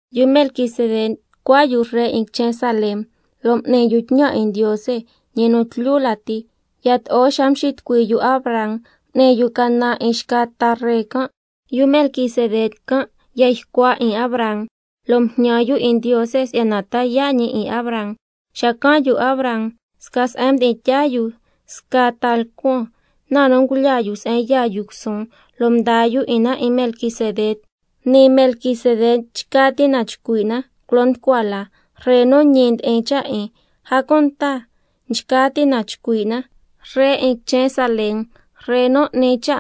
—Yu Melquisedec ncua yu Ree 'in quichen Salem, lo' m'ni yu tñan 'in Ndiose, ñi nu tlyu lati. Yato'o xa mxitucui yu Abraham m'ni yu canan 'in xca ta ree can', yu Melquisedec can' ya ycua 'in Abraham, lo' mjñan yu 'in Ndiose si'yana ta yaa' ñi 'in Abraham—. Xacan' yu Abraham sca se'en mdi'in tyaa yu scaa ta lcuan, na nu ngulyaa yu se'en yaa yu cusuun, lo' mdaa yu 'in na 'in Melquisedec. Nii Melquisedec nchca ti' na chcui' na culo nducua la: Ree nu ñi ndi'in cha' 'in, a cunta nchca ti' na chcui' na Ree 'in quichen Salem, Ree nu n'ni cha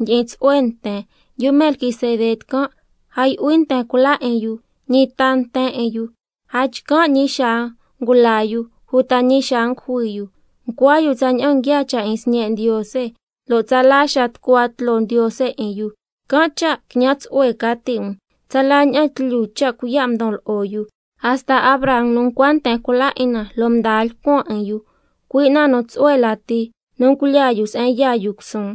ndyi'in tsu'hue nten. Yu Melquisedec can' a yu'hui nten cula 'in yu, ñi ta nten 'in yu, a chcan' ñi xaa ngula yu uta ñi xaa ngujui yu, ncua yu tsaña'an nguiaa cha' 'in Sñe' Ndiose, lo' tsala xaa tucua tloo Ndiose 'in yu. Can' cha' quiñan tsu'hue ca ti' um, tsala ña'an tlyu cha' cuiya' ndon lo'o yu, hasta Abraham nu ncua nten cula 'in na lo' mdaa lcuan 'in yu, cui' na nu tsu'hue lati nu ngulyaa yu se'en yaa yu cusuun.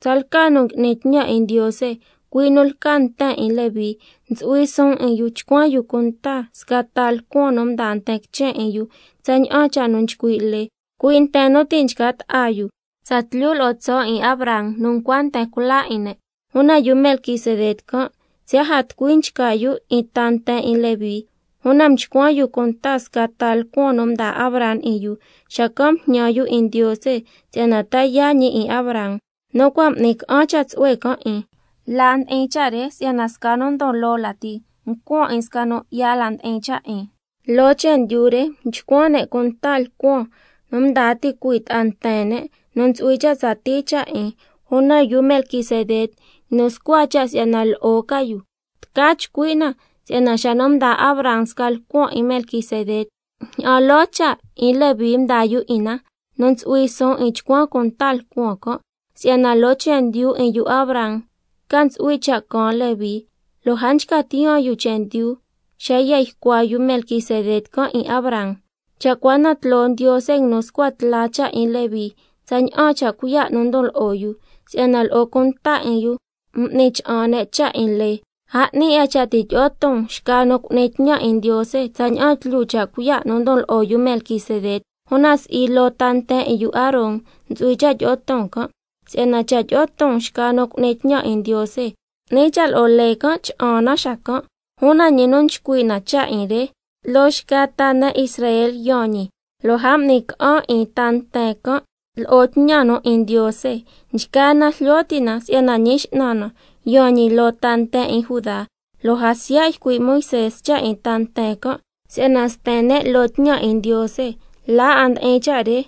Tsalca nu ngui'ni tñan 'in Ndiose, cui' nu lca ta nten 'in Levi, ntsu'hui suun 'in yu chcuan yu cunta sca ta lcuan nu ndaa nten quichen 'in yu tsaña'an cha' nu nchcui' lee, cui' nten nu ti' nchca ta'a yu tsatlyu lo'o tso' 'in Abraham nu ncua nten cula 'in ne'. Una yu Melquisedec can', siya' a tucui nchca yu 'in ta nten 'in Levi, una mchcuan yu cunta sca ta lcuan nu mdaa Abraham 'in yu, xacan' mjñan yu 'in Ndiose si'yana ta yaa' ñi 'in Abraham, nu cua' m'ni ca'an cha' tsu'hue can' 'in. La ndi'in cha' re si'yana sca nu ndon loo lati yato'o mcuan yu 'in sca nu 'ya la ndi'in cha' 'in. Loo chendyu re nchcuan ne' cunta lcuan nu ndaa ticui' ta'a nten ne' nu ntsu'hui cha' tsatii cha' 'in, una yu Melquisedec nguinu scua cha' si'yana lo'o ca yu. Tca chcui' na si'yana xa nu mdaa Abraham sca lcuan 'in Melquisedec, ña'an loo cha' 'in Levi mdaa yu 'in na, nu ntsu'hui suun 'in chcuan cunta lcuan can', si'yana loo chendyu 'in yu Abraham ca ntsu'hui cha' caan Levi, lo' a nchca tiyaan yu chendyu xa ya ycua yu Melquisedec can' 'in Abraham. Cha' cua na tloo Ndiose nguinu scua tla cha' 'in Levi tsaña'an cha' cuiya' nu mdon lo'o yu (si'yana lo'o cunta 'in yu m'ni cha'an ne' cha' 'in lee), a 'ni 'a cha' ti' tyi'o ton xca nu cu'ni tñan 'in Ndiose tsaña'an tlyu cha' cuiya' nu ndon lo'o yu Melquisedec, una si'i loo ta nten 'in yu Aaron ntsu'hui cha' tyi'o ton can'. Si'yana cha' tyi'o ton xca nu cu'ni tñan 'in Ndiose, 'ni cha' lo'o lee can' cha'an na xacan'. Una ñi nu nchcui' na cha' 'in re, loo xca ta ne' Israel yaan ñi, lo' a m'ni ca'an 'in ta nten can' lo'o tñan nu 'in Ndiose. Nchgaa na jlyo ti' na si'yana Ñi X'nan na yaan ñi loo ta nten 'in Judá, lo' a siya' ycui' Moisé cha' 'in ta nten can' si'yana sten ne' loo tñan 'in Ndiose. La 'a ndi'in cha' re,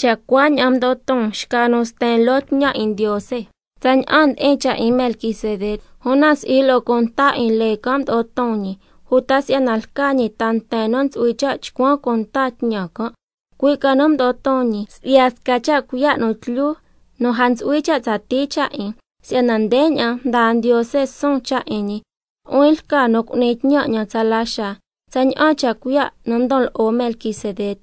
cha' cuaña'an mdo'o ton xca nu sten loo tñan 'in Ndiose, tsaña'an ndi'in cha' 'in Melquisedec, una si'i lo'o cunta 'in lee can' mdo'o ton ñi, uta si'yana lca ñi ta nten nu ntsu'hui cha' chcuan cunta tñan can', cui' ca nu mdo'o ton ñi si'ya sca cha' cuiya' nu tlyu nu a ntsu'hui cha' tsatii cha' 'in. Si'yana ndeña'an ndaa Ndiose suun cha' 'in ñi: —Nu'huin lca nu cu'ni tñan 'ñan tsala xaa, tsaña'an cha' cuiya' nu ndon lo'o Melquisedec—.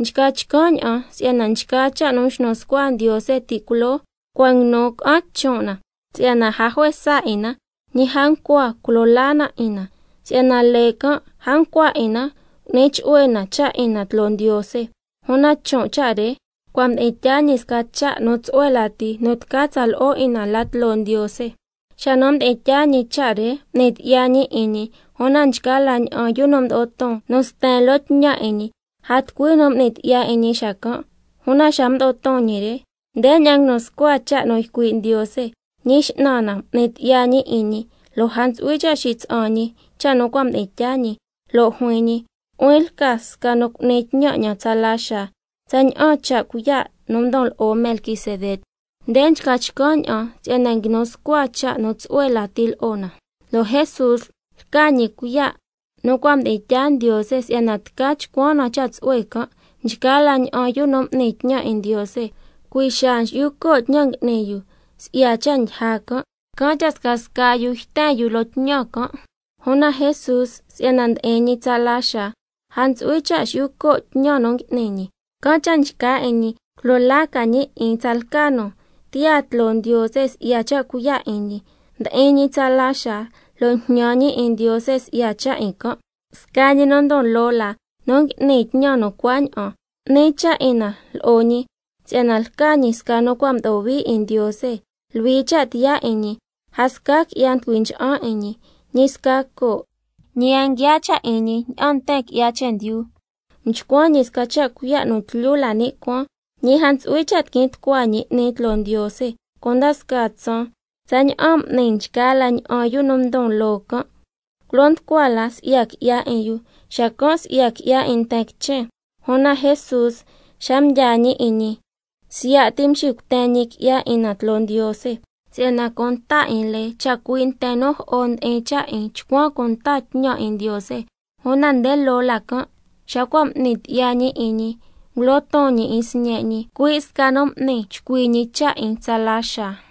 Nchca chcan' ña'an si'yana nchgaa cha' nu mxnu scua Ndiose ti' culoo cua' nguinu ca'an chon' na, si'yana a juesa 'in na, ñi a ncua culo laa na 'in na, (si'yana lee can' a ncua 'in na cu'ni chu'hue na cha' 'in na tloo Ndiose), una chon' cha' re cua' mdi'in tyaa ñi sca cha' nu tsu'hue lati nu tca tsa lo'o 'in na la tloo Ndiose. Xa nu mdi'in tyaa ñi cha' re, m'ni tyi'ya ñi 'in ñi, una nchgaa la ña'an yu nu mdo'o ton nu sten loo tñan 'in ñi, a tucui nu m'ni tyi'ya 'in ñi xacan', una xa mdo'o ton ñi re, ndeña'an nguinu scua cha' nu ycui' Ndiose: —Ñi X'nan na m'ni tyi'ya ñi 'in ñi, lo' a ntsu'hui cha' xitsa'an ñi cha' nu cua' mdi'in tyaa ñi—, lo' juin ñi: —Nu'huin lca sca nu cu'ni tñan 'ñan tsala xaa, tsaña'an cha' cuiya' nu ndon lo'o Melquisedec—. Nde nchca chcan' ña'an si'yana nguinu scua sca cha' nu tsu'hue lati lo'o na, lo' Jesús lca ñi cuiya' nu cua' mdi'in tyaa Ndiose si'yana tca chcuan na cha' tsu'hue can'. Una nchgaa la ña'an yu nu m'ni tñan 'in Ndiose, cui' xaa nxi'yu co' tñan nu ngui'ni yu si'ya cha' ndyija can', can' cha' scasca yu yten yu loo tñan can', una Jesús si'yana ndi'in ñi tsala xaa, a ntsu'hui cha' xi'yu co' tñan nu ngui'ni ñi, can' cha' nchca 'in ñi culo laa ca ñi 'in tsalca nu tiyaa tloo Ndiose si'ya cha' cuiya' 'in ñi, ndi'in ñi tsala xaa lo' njñan ñi 'in Ndiose si'ya cha' 'in can'. Sca ñi nu ndon loo la nu ngui'ni tñan nu cuaña'an, 'ni cha' 'in na lo'o ñi si'yana lca ñi sca nu cua' mdo'o hui 'in Ndiose, luhui cha' tiyaa 'in ñi, a sca qui'ya nducui ncha'an 'in ñi, ñi sca coo', ñi a nguiaa cha' 'in ñi ña'an nten qui'ya chendyu, mchcuan ñi sca cha' cuiya' nu tlyu la ni' cuaan. Ñi a ntsu'hui cha' tiquin tucua ñi 'ni tloo Ndiose cunda scaa tsaan tsaña'an m'ni nchgaa la ña'an yu nu ndon loo can', culo nducua la si'ya qui'ya 'in yu, xacan' si'ya qui'ya 'in nten quichen, una Jesús xa mdyaa ñi 'in ñi, siya' ti mxicuten ñi qui'ya 'in na tloo Ndiose. Si'yana cunta 'in lee chacui' nten nu jo'o ndi'in cha' 'in nchcuan cunta tñan 'in Ndiose, una nde loo la can' xa cua' m'ni tyi'ya ñi 'in ñi, ngulo ton ñi 'in Sñe' ñi, cui' sca nu m'ni chcui ñi cha' 'in tsala xaa.